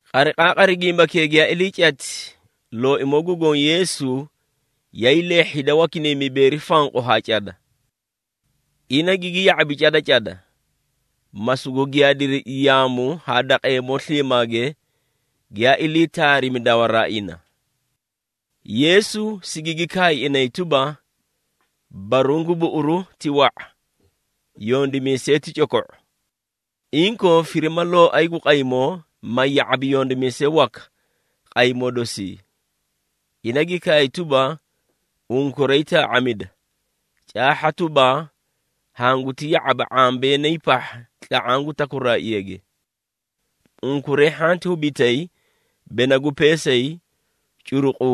Qariqaaqari gimbakee giyaa ilii cati, Looimoo gu Goõ Yeesu yaay leehhi hida wakinay mibeeri fanqu haa cada. Ina gigi ya⁄abi cada cada, ma sugu giyaadiri yaamu haa daqeemoo sliimaage, giyaa ilii taarimi dawaraa ina. Yeesu sigigi kaay inay tuba, “Baruũ gu buꞌuru ti wa⁄a, yondimiisee ti coko⁄o. Inkoo, firima Looay gu Qaymoo, ma ya⁄abi yondimiisee waka qaymoo dosii.” Ina gi kaay tuba, “Unkuray taa⁄amida, caahha tuba, hanguti ya⁄aba ⁄ambeenay pahha tla⁄aã gu takuraaꞌage! Unkuray hhanti hubitay bena gu peesay, curuqu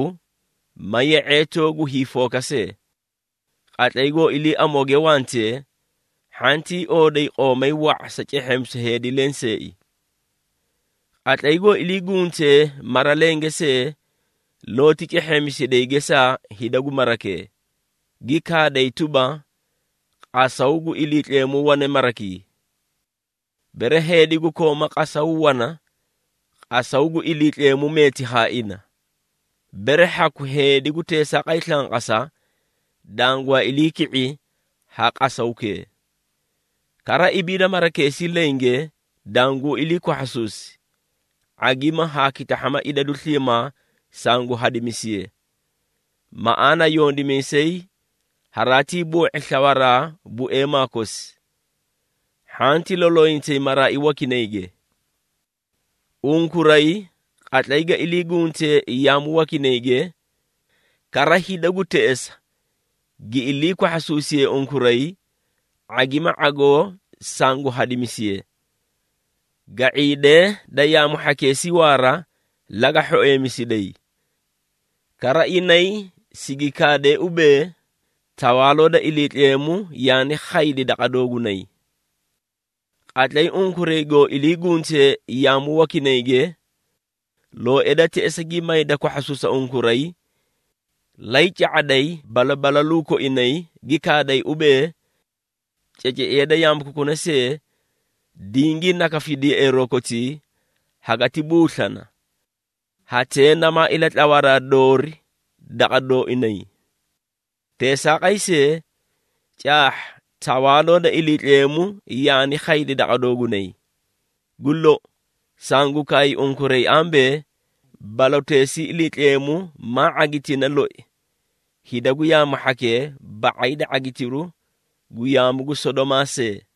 ma ye⁄eetoo gu hiifooka see. Qatlay goo ilii amooge wantee, hhantii ooday qoomay wa⁄a sa cehheemisu heedi lenseei. Qatlay goo ilii guntee mara lenge see, looti cehheemisiday gesaa hida gu marakee, gi kaaday tuba, ‘Qasaw gu Iliitleemu wane marakii.’ Bere heedi gu kooma qasaw wana, qasaw gu Iliitleemu meeti haa ina. Bere hhaku heedi gu teesaaqay slanqasa, dangwaa ilii ki⁄i ha qasawkee. Kara ibiida marakeesii lenge, danguu ilii kwahhasuusi, ⁄agima haa kitahhama idadu sliimaa sangu hadimisiye. Maꞌaana yondimiisay haraatii boo⁄i slawaraa bueemaa kosi. Hhanti loloyintayi maraai wakinayge. Unkuray, qatlay ga ilii guntee yaamu wakinayge, kara hida gu teꞌesa gi ilii kwahhasuusiyee unkuray, ⁄agima ⁄agoo sangu hadimisiye. Ga⁄iidee da yaamu hhakeesii waara, laga hhoeemisiday. Kara inay sigi kaadee ubee, ‘Tawaaloo da Iliitleemu yaani khaydi daqa doogunay.’ Qatlay unkuray goo ilii guntee yaamu wakinayge, looee da teꞌesa gi mayda kwahhasuusa unkuray, lay ca⁄aday balabalaluu koinay, gi kaaday ubee, ‘Ceceiya da yaamu kokuna see, dingii nakafidi yeꞌeeroo kotii, hagati buuslana, hatee namaa ilatlawaraa doori daqa dooinay. Teesaaqay see, caahha, Tawaaloo da Iliitleemu yaani khaydi daqa doogunay!’ Gu lou, sangu kaay unkuray ambee, baloteesii Iliitleemu maa ⁄agitina loi hida gu yaamu hhakee ba⁄ay da ⁄agitiru gu yaamu gu Sodomaa see!”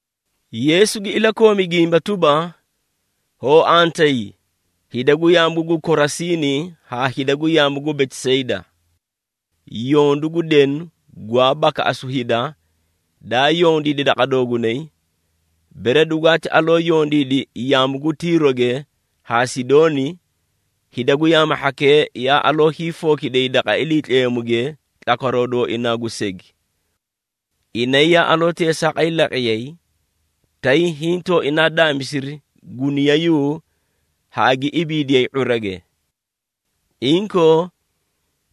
Yeesu gi ilakoomi gimba tuba, “Hoo antayi, hida gu yaamu gu Korasiini haa hida gu yaamu gu Betisayda! Yondu gu denu gwaa bakaꞌasu hida, daa yondiidi daqa doogunay, bere dugwaati aloo yondiidi yaamu gu Tiiroge haa Sidooni, hida gu yaamu hhakee yaa aloo hiifookidiyay daqa Iliitleemuge tlakwaroo dooinaa gu segi. Inay yaa aloo teesaaqay laqiyay, tay hiĩ tooinaa daamisiri guniyayuu haa gi ibiidiyay ⁄urage. Inkoo,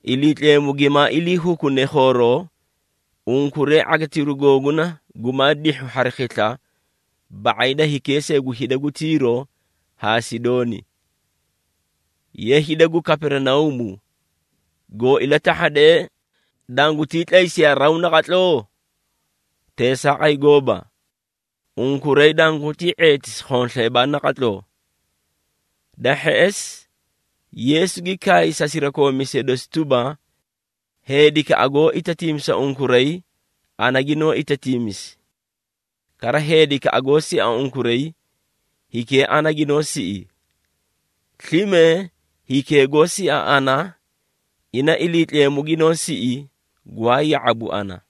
Iliitleemu gimaa ilii hukune khooroo, unkuray ⁄agitiru googuna gumaa dihhu hari khisla ba⁄ay da hikee see gu hida gu Tiiro haa Sidooni. Ye, hida gu Kaperinauumu, goo ilatahhadee, dangutii tlaysiyaa raw naqatloo? Teesaaqay gooba! Unkuray dangutii ⁄eetisi khonsleebaa naqatloo.” Da hheꞌesi, Yeesu gi kaay sa sirakoomiisee dosi tuba, “Heedikaꞌa goó itatiimisa unkuray, ana ginoó itatiimisi. Kara heedikaꞌa goó sia unkuray, hikee ana ginoó siꞌi. Slime hikee goó sia ana, ina Iliitleemu ginoó siꞌi, gwaa ya⁄abu ana.”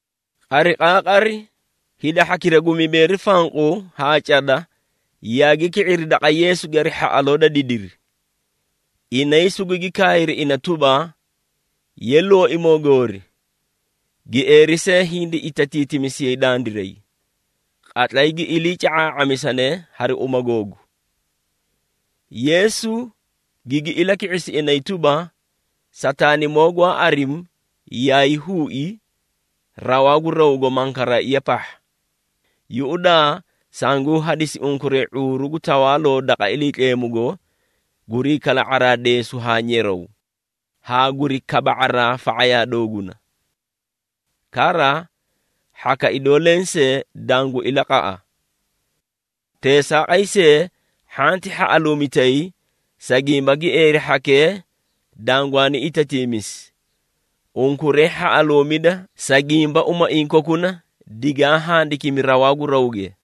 Qariqaaqari, hida hhakira gu mibeeri fanqu haa cada yaagi ki⁄iri daqa Yeesuge hari hhaꞌaloo da didiri. Inay sugugi kaayri ina tuba, “Ye, Looimoo goori, gieeri see hindi itatiitimisiyay dandiray, qatlay gi iliica⁄aa⁄amisane hari uma googu.” Yeesu gigi ilaki⁄isi inay tuba, “Sataanimoo gwaa arimi yaay huui rawaa gu rawgo mankaraaiya pahha. Yuꞌudaa, sanguu hadisi unkuray ⁄uuru gu tawaaloo daqa Iliitleemugo gurii kala⁄araa deesu haa nyeraw, haa guri kaba⁄araa fa⁄ayaa dooguna. Kara, hhaka idoo lensee dangu ilaqaꞌa. Teesaaqay see, hhanti hhaꞌaluumitay, sa gimba gieeri hhakee dangwaani itatiimisi. Unkuray hhaꞌaluumida, sa gimba umaiĩ kokuna digaa handikimi rawaa gu rawge.”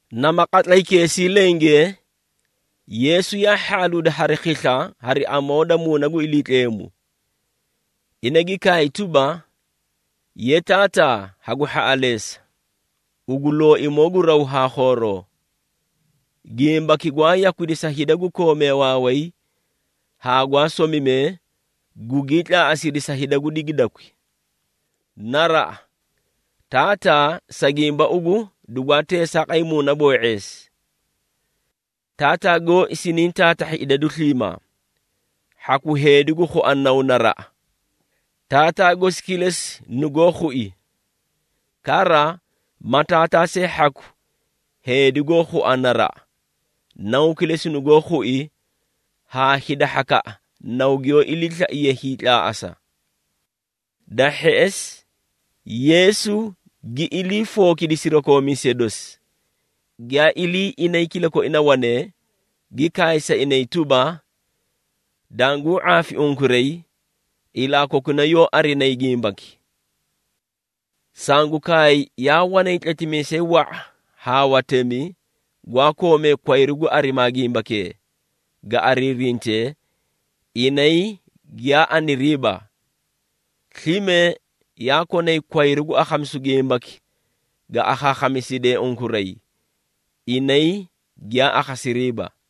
Nama qatlaykeesii lenge, Yeesu yaa hhaꞌaluudi hari khisla hari amoo da Muuna gu Iliitleemu. Ina gi kaay tuba, “Ye, Taataa hagu hhaꞌaleesa, ugu Looimoo gu raw haa khooroo! Gimbaki gwaa yakwidi sa hida gu koomee waaway haa gwaa somimee, gugii tlaaꞌasidi sa hida gu digidakwi. Naraꞌa, Taataa, sa gimba ugu dugwaa teesaaqay muunaboo⁄eesi. Taataa gooi siniĩ taatahhi idadu sliimaa. Hhaku heedi goó khua Naw naraꞌa, Taataa gosi kilesi nugoó khui. Kara, ma Taataa see hhaku heedi goó khua naraꞌa, Naw kilesi nugoó khui haa hida hhakaꞌa Naw giyoo iliislaiye hiitlaaꞌasa.” Da hheꞌesi, Yeesu gi ilii fookidi sirakoomiisee dosi, giyaa ilii inay kilakoina wanee, gi kaay sa inay tuba, “Danguu ⁄aafi unkuray, ilaa kokuna yoó arinayi gimbaki! Sangu kaay yaa wanay tletimiisee wa⁄a haa watemi, gwaa koomee kwayru gu arimaa gimbakee, ga ariirintee, inay giyaa aniriiba. Slime yaa konay kwayru gu akhamisu gimbaki ga akhaakhamiside unkuray, inay giyaa akhasiriiba.”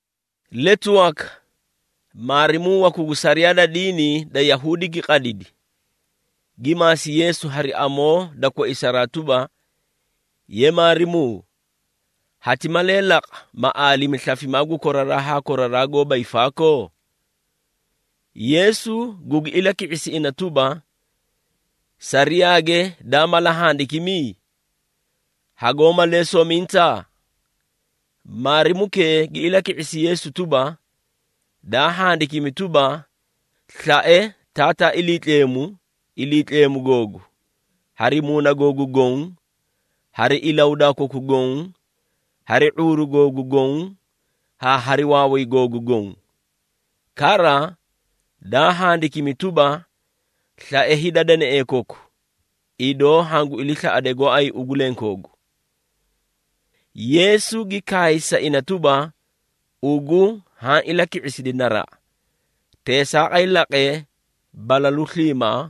Letu waka, maarimuu waku gu sariyaa da diini da Yahuudi gi qadidi, gi maasi Yeesu hari amoo da koisaraa tuba, “Ye, Maarimuu, hati malee laqa, ma aalimi slafimaa gu koraraa haa koraraa goóba hiifaakoo?” Yeesu gugi ilaki⁄isi ina tuba, “Sariyaage daa mala handikimi? Hagoó malee sominta?” Maarimukee gi ilaki⁄isi Yeesu tuba, “Daa handikimi tuba, ‘Slae Taataa Iliitleemu, Iliitleemu googu, hari ilahudaa koku goõ, hari slafimaa koku goõ, hari ⁄uuru googu goõ haa hari waaway googu goõ.’ Kara, daa handikimi tuba, ‘Slae hida danaee koku, idoo hangu iliislaꞌade gooay ugu lenkoogu.’” Yeesu gi kaay sa ina tuba, “Ugu haã ilaki⁄isidi naraꞌa. Teesaaqay laqe balalu sliimaa,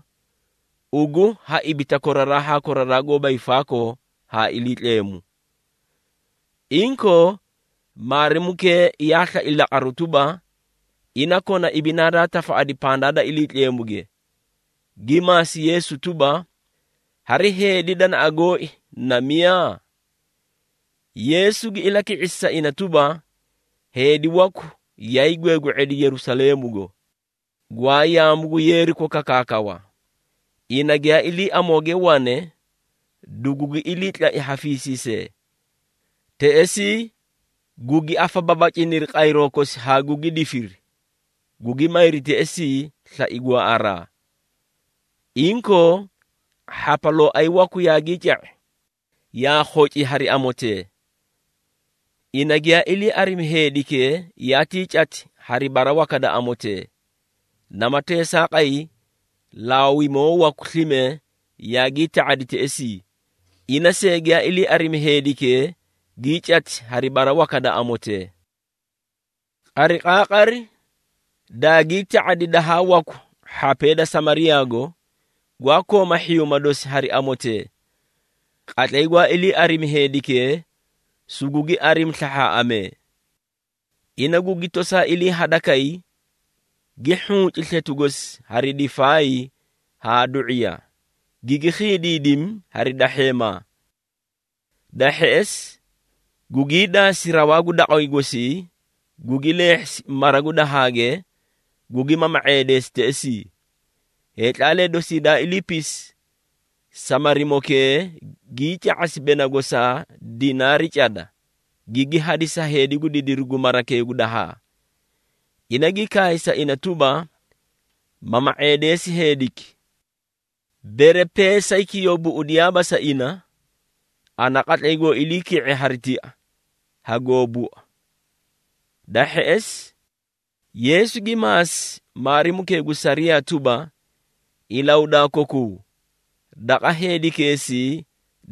ugu ha ibita koraraa haa koraraa goóba hiifaakoo haa Iliitleemu.” Inkoo, maarimukee yaa slai laqaruu tuba, ina kona ibinaa daa tafaꞌadi pandaa da Iliitleemuge, gi maasi Yeesu tuba, “Hari heedi danaꞌa gooi, na miyaa?” Yeesu gi ilaki⁄isi sa ina tuba, “Heedi waku yaay gweegwe⁄edi Yerusaleemugo, gwaa yaamu gu Yeeriko kakaakawa. Ina giyaa ilii amooge wane, dugugi iliitlai ha fiisiisee. Teꞌesii, gugi afababaciniri qayroo kosi haa gugi difiri, gugi mayri teꞌesii, slai gwaaꞌaraa. Inkoo, hhapalooay waku yaagii ca⁄i, yaa khoci hari amotee. Ina giyaa ilii arimi heedikee, yaatii cati hari bara waka da amotee. Nama teesaaqay, Laawimoo waku slime yaagii ta⁄adi teꞌesii, ina see giyaa ilii arimi heedikee, gii cati hari bara waka da amotee. Qariqaaqari daagii ta⁄adi dahaa waku hhapee da Samariyaago, gwaa kooma hhiyuuma dosi hari amotee. Qatlay gwaa ilii arimi heedikee, sugugi arimi slahhaaꞌamee. Ina gugi tosaa ilii hadakay, gi hhunci sletu gosi hari difaay haa du⁄iya, gigi khiidiidimi hari dahheemaa. Da hheꞌesi gugii daasi rawaa gu daqway gosii, gugi leehhisi mara gu dahaage, gugi mama⁄eedeesi teꞌesii. Heetlaalee dosii daa iliipisi, Samarimokee gii ca⁄asi bena gosaa dinaari cada, gigi hadisi sa heedi gu didiru gu marakee gu dahaa. Ina gi kaay sa ina tuba, ‘Mama⁄eedeesi heediki. Bere peesayki yoo buꞌudiyaaba sa ina, ana qatlay goo ilii ki⁄e hari tia, hagoo bua.’” Da hheꞌesi, Yeesu gi maasi maarimukee gu sariyaa tuba, “Ilahudaa kokuu, daqa heedikeesii,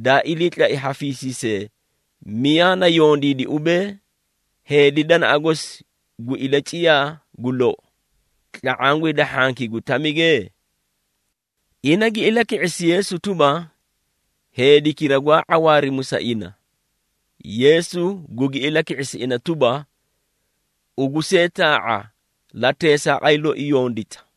daa iliitlai haa fiisiisee, miyaa na yondiidi ubee, heedi danaꞌa gosi gu ilaciyaa gu lou, tla⁄aã gu hida hhankii gu tamige?” Ina gi ilaki⁄isi Yeesu tuba, “Heedikira gwaa ⁄awaarimu sa ina.” Yeesu gugi ilaki⁄isi ina tuba, “Ugu see taa⁄a, la teesaaqay loi yondita.”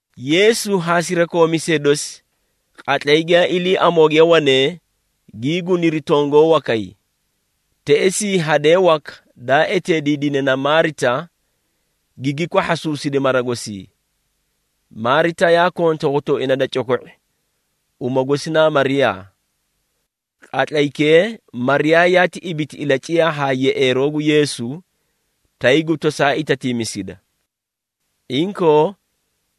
Yeesu haa sirakoomiisee dosi qatlay giyaa ilii amooge wanee, gii guniri tongoo wakay. Teꞌesii hadee waka, daa eteediidine na Maarita, gigi kwahhaasuusidi mara gosii. Maarita yaa konta hotooina da coko⁄i, uma gosi naa Mariyaa. Qatlaykee Mariyaa yaati ibiti ilaciyaa haa yeꞌeeroo gu Yeesu, tay gu tosaa itatiimisida. Inkoo,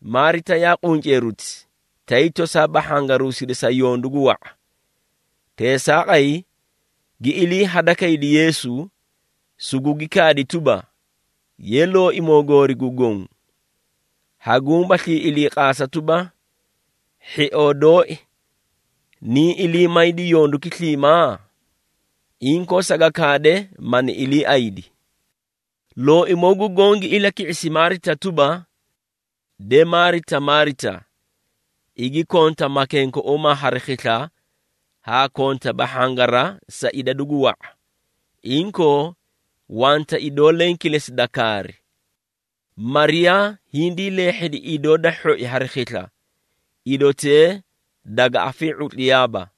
Maarita yaa qunceeruti, tay tosaa bahhangaruusida sa yondu gu wa⁄a. Teesaaqay gi ilii hadakaydi Yeesu, sugugi kaadi tuba, “Ye, Looimoo Goorii gu Goõ, haguũ baslii iliiqaasa tuba, hhioo dooi niĩ ilii maydi yonduki sliimaa? Inkoo, saga kaade mani iliiaydi!” Looimoo gu Goõ gi ilaki⁄isi Maarita tuba, “De Maarita, Maarita. Igi konta makenkeuumaa hari khisla haa konta bahhangara sa idadu gu wa⁄a. Inkoo, wanta idoo leẽ kilesi da kaari. Mariyaa hindii leehhedi idoo da hhoi hari khisla, idotee daga afii⁄utliyaaba.”